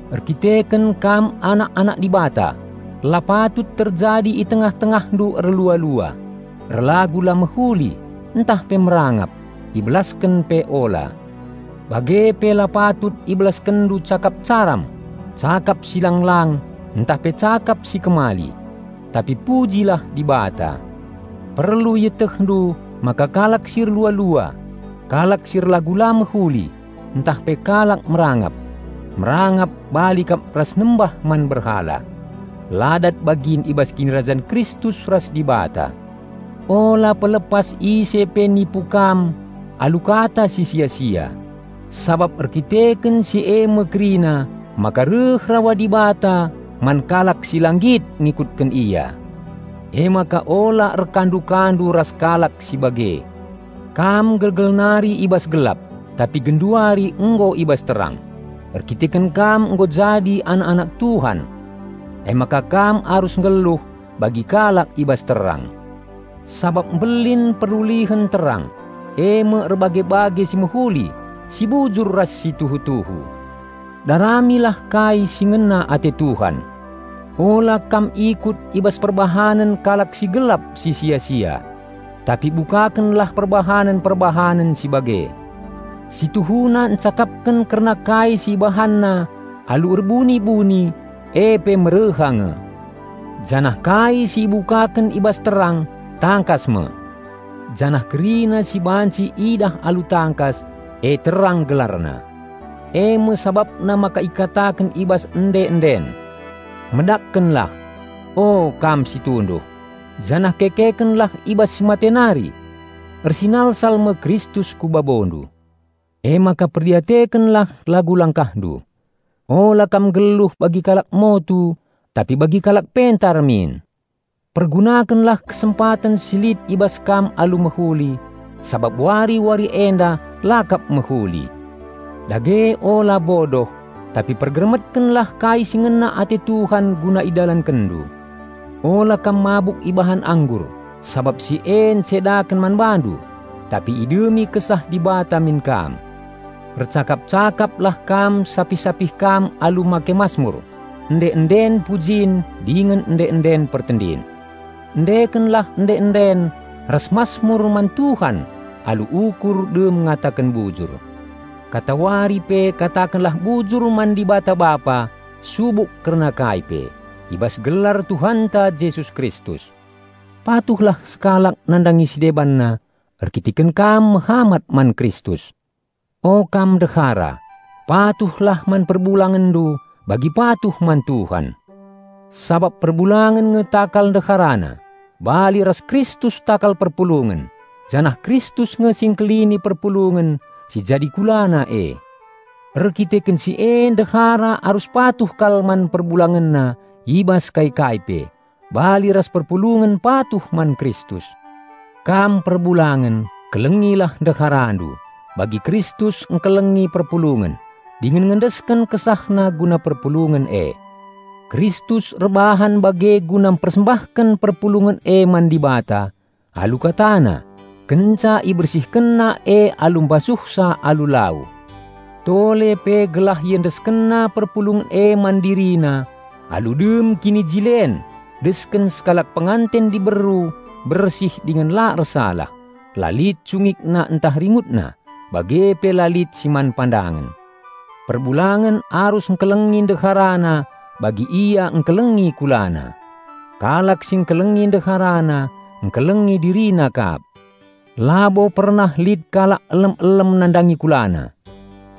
Erdandanken kam anak-anak Dibata, la patut terjadi i tengah-tengahndu erlua-lua, erlagu la mehuli ntah pe merangap; ibelasken pe ula. Bage pe la patut ibelaskenndu cakap caram, cakap si lang-lang ntah pe cakap si kemali. Tapi pujilah Dibata. Perlu ietehndu maka kalak si erlua-lua, kalak si erlagu la mehuli ntah pe kalak merangap (merangap bali kap ras nembah man berhala) la dat bagin i bas Kinirajan Kristus ras Dibata. Ula pelepas ise pe nipu kam alu kata si sia-sia; sabap erdandanken si e me kerina maka reh rawa Dibata man kalak si la nggit ngikutken Ia. Emaka ula erkandu-kandu ras kalak si bage. Kam gelgel nari i bas gelap, tapi genduari nggo i bas terang, erdandanken kam nggo jadi anak-anak Tuhan. Emaka kam arus nggeluh bagi kalak i bas terang. Sabap mbelin perulihen terang, eme erbage-bage si mehuli, si bujur ras si tuhu-tuhu. Daramilah kai si ngena ate Tuhan. Ula kam ikut i bas perbahanen kalak si gelap si sia-sia. Tapi bukakenlah perbahanen-perbahanen si bage. Si tuhuna ncakapken kerna kai si ibahanna alu erbuni-buni e pe mereha nge. Janah kai si ibukaken i bas terang, tangkas me. Janah kerina si banci idah alu tangkas, e terang gelarna. Eme sabapna maka ikataken i bas ende-enden: "Medakkenlah, o, kam si tunduh, janah kekekenlah i bas si mate nari! Ersinalsal me Kristus ku babondu." Emaka perdiatekenlah lagu langkahndu. Ula kam nggeluh bagi kalak motu, tapi bagi kalak pentar min. Pergunakenlah kesempaten si lit i bas kam alu mehuli, sabap wari-wari enda la kap mehuli. Dage ula bodoh, tapi pergermetkenlah kai si ngena ate Tuhan guna idalankenndu. Ula kam mabuk ibahan anggur, sabap si e encedaken man bandu. Tapi idemi Kesah Dibata min kam. Ercakap-cakaplah kam sapih-sapih kam alu make masmur, ende-enden pujin dingen ende-enden pertendin. Endekenlah ende-enden ras masmur man Tuhan alu ukur dem ngataken bujur. Katawari pe katakenlah bujur man Dibata Bapa subuk kerina kai pe, i bas gelar Tuhanta Jesus Kristus. Patuhlah sekalak nandangi si debanna, erdandanken kam mehamat man Kristus. O kam ndehara, patuhlah man perbulangenndu bagi patuh man Tuhan. Sabap perbulangen nge takal ndeharana, bali ras Kristus takal perpulungen, janah Kristus nge si Engkelini perpulungen si jadi KulaNa e. Erdandanken si e ndehara arus patuh kal man perbulangenna i bas kai-kai pe, bali ras perpulungen patuh man Kristus. Kam perbulangen, kelengilah ndeharandu, bagi Kristus engkelengi perpulungen, dingen ngendesken KesahNa guna perpulungen e. Kristus erbahan bage guna mpersembahken perpulungen e man Dibata, alu KataNa, kenca IbersihkenNa e alu mbasuhsa alu lau. Tole pe gelah IendeskenNa perpulungen e man DiriNa alu dem kinijilen desken sekalak penganten diberu bersih dingen la ersalah, la lit cungikna ntah ringutna, bage pe la lit si man pandangen. Perbulangen arus engkelengi ndeharana bagi ia engkelengi kulana. Kalak si engkelengi ndeharana, engkelengi dirina kap. Labo pernah lit kalak elem-elem nandangi kulana.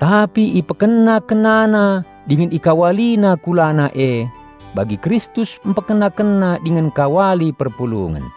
Tapi ipekena-kenana dingen ikawalina kulana e bagi Kristus mpekena-kena dingen engkawali perpulungen.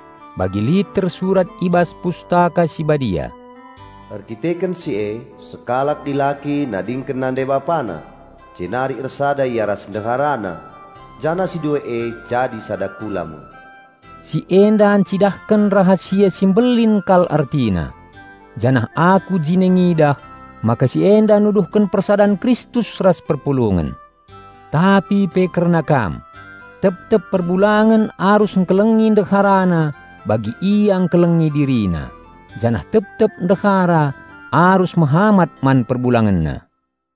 Bagi lit tersurat i bas Pustaka Si Badia, "Erdandanken si e, sekalak dilaki nadingken nande bapana, jenari ersada ia ras ndeharana, janah si dua e jadi sada kula me." Si enda ncidahken rahasia si mbelin kal ertina. Janah aku jine ngidah, maka si enda nuduhken persadan Kristus ras perpulungen. Tapi pe kerna kam: Tep-tep perbulangen arus engkelengi ndeharana bagi ia engkelengi dirina, janah tep-tep ndehara arus mehamat man perbulangenna.